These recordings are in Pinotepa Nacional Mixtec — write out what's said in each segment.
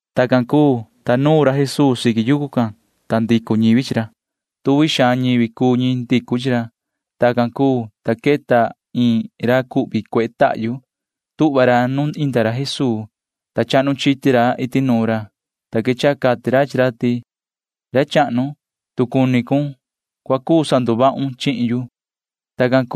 Tacan cuu, ta nuun ra Jesuu siqui yucu can, ta ndicu ñivi can chi ra. Tuvi xaan ñivi cuu ñi ndicu chi ra. Tacan cuu, ta queta iin ra cuehe tahyu. Tuhva ra nuun iyo ra Jesuu, ta chahnu chiti ra iti nuun ra, ta quechaha cati ra chi ra ti: ―Yoho ra chahnu, tu cuni cun, cua cuu sanduvahun chihin yu ―cati ra ndahvi can.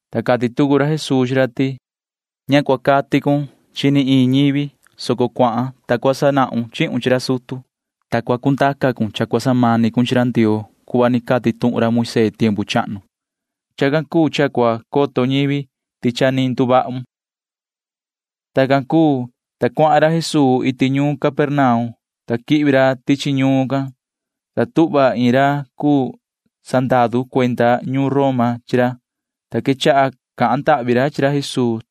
ta cati tucu ra Jesuu chi ra ti: ―Ña cua cahun ni chi iin ñivi, soco cuahan. Cua sanahun chihun chi ra sutu, ta cua cundaca cun cha cua samani cun chi ra Ndioo cuhva ni cati tuhun ra Moisee tiempu chahnu. Chacan cuu cha cua coto ñivi ti cha ni nduvahun ―cati ra. Tacan cuu, ta cuahan ra Jesuu iti ñuun Capernaum. Cua quihvi ra tichi ñuun can, ta tuhva iin ra cuu sandaru cuenda ñuun Roma, ta quechaha cahan ndahvi ra chi ra Jesuu.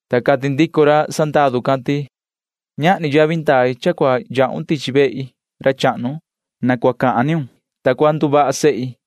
Ta cati ndico ra sandaru can ti: ―Ñahni yavi ndai cha cua yahun tichi vehi, ra chahnu. Na cua cahun tuhun ni, ta cua nduvaha sehi.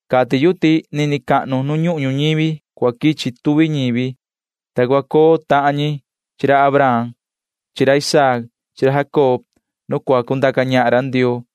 Cati yu ti nini cahnu nu ñuhun ñuñivi cua quichi tuvi ñivi, ta cua coo tahan ñi chi ra Abraham chi ra Isaac chi ra Jacob nu cua cundaca ñahan ra Ndioo,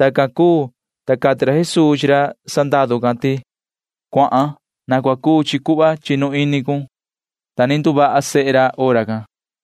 Tacan cuu, ta cati ra Jesuu chi ra sandaru can ti: ―Cuahan. Na cua cuu chi cuhva chinu ini cun ―cati ra. Ta ni nduvaha sehe ra hora can.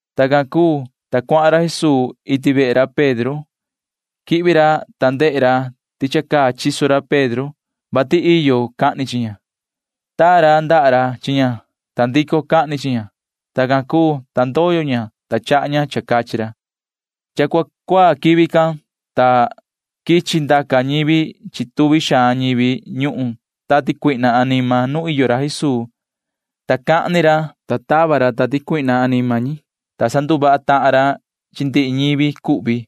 Tacan cuu, ta cuahan ra Jesuu iti vehe ra Pedro. Quihvi ra, ta ndehe ra ti cha ni caa chiso ra Pedro, vati iyo cahni chi ña. Taa ra ndaha ra chi ña, ta ndico cahni chi ña. Tacan cuu, ta ndoyo ña, ta chaha ña cha cachi ra. Cha cua cuaa quivi can, ta cha quichi ndaca ñi chi tuvi xaan ñivi ñuhun tati cuihna anima tican nu iyo ra Jesuu, ta sa cahan ni ra tuhun, ta tava ndaa ra chi run tati cuihna can anima ñi, ta sanduvaha tahan ra chi ndihi ñivi cuhvi.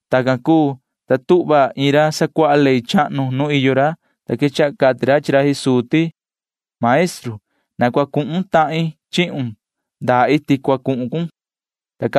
Tacan cuu, ta tuhva iin ra sacuaha ley chahnu can nu iyo ra, ta quechaha cati ra chi ra Jesuu ti: ―Yoho maestru, na cua cuhun tahin chihun ndaa iti cua cuhun cun ―cati ra.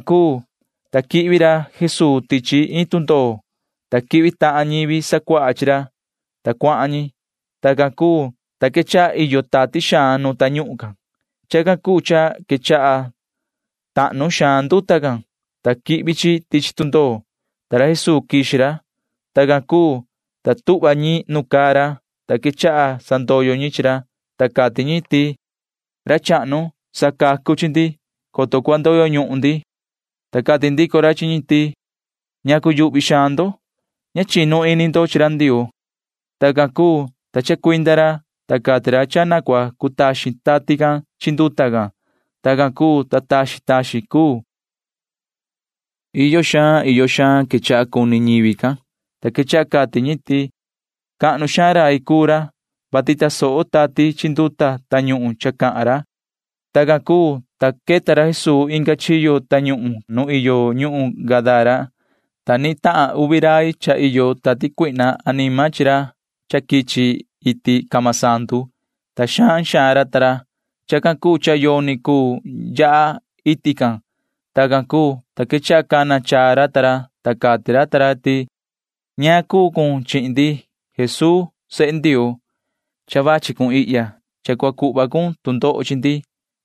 Tacan cuu, ta quihvi ra Jesuu tichi iin tundoo, ta quihvi tahan ñivi sacuaha chi ra, [ta cuahan ñi]. Tacan cuu, ta quechaha iyo tati xaan nu tañuhun can. Chacan cuu cha cahnu xaan tahnu nduta nu tundoo can, ta quihvi chi tichi tundoo, ta ni quixi ra Jesuu. Tacan cuu, ta tuhva ñi nu caa ra, ta quechaha sandoyo ñi chi ra, ta cati ñi ti: ―Ra chahnu, sacacu chi ndi, coto cua ndoyo ñuhun ndi ―cati ñi. Ta cati ndico ra chi ñi ti: ―¿Ñacu yuhvi xaan ndo? Ña chinu ini ndo chi ra Ndioo ―cati ra. Tacan cuu, ta chacuinda ra, ta cati ra ti cua cutaxin tati can chi nduta can. Tacan cuu, ta taxin taxin cuu. Iyo xaan iyo xaan quechaha cuni ñivi can, ta quechaha cati ñi ti: ―Cahnu xaan rai cuu ra, vati tasoho tati chi nduta tañuhun cha cahan ra ―cati ñi. Tacan cuu, ta queta ra Jesuu inga chiyo tañuhun can nu iyo ñuhun Gadara, ta nitahan uvi rai chi ra. Cha iyo tati cuihna anima ra ta ra, ta sa quichi ra ta ra iti camasandu. Xaan xaan ra cuu. Chacan cuu cha yoni cuu yaha iti can. Tacan cuu, ta quechaha cana chaa ra ta ra, ta cati ra ta ra ti: ―¿Ñaan cha cuu cha cuni cun chi ndi, ta yoho ra cuu sehe Ndioo? Cha vachi cun ihya, vati cua cuhva cun tu ndoho chi ndi,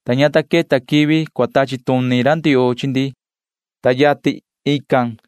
ta ña ta queta quivi cua tachi tuni ra Ndioo chi ndi ―cati ra ta ra chi ra Jesuu.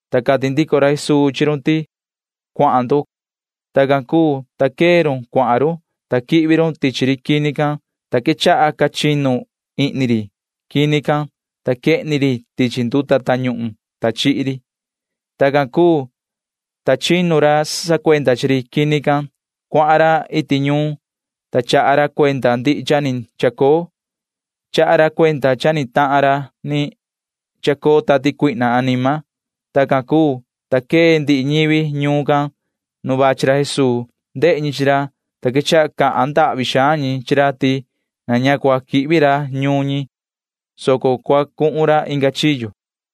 Ta cati ndico ra Jesuu chi run ti: ―Cuahan ndo ―cati ra. Tacan cuu, ta quee run cuahan run, ta quihvi run tichi maan ri quini can, ta jihna quechaha ca chinu ndihi ri tichi xahva can, ta quehni ri tichi nduta tañuhun can, ta chihi ri. Tacan cuu, ta chinu ra sacuenda chi ri quini can. Cuahan ra iti ñuun, ta chaha ra cuenda ndihi cha ni chacoo. Chaha ra cuenda cha ni tahan ra ni chacoo tati cuihna anima. Tacan cuu, ta quee ndihi ñivi ñuun can nu vachi ra Jesuu. Ndehe ñi chi ra, ta quechaha cahan ndahvi xaan ñi chi ra ti na ña cua quihvi ra ñuun ñi, [soco cua cuhun ra inga chiyo].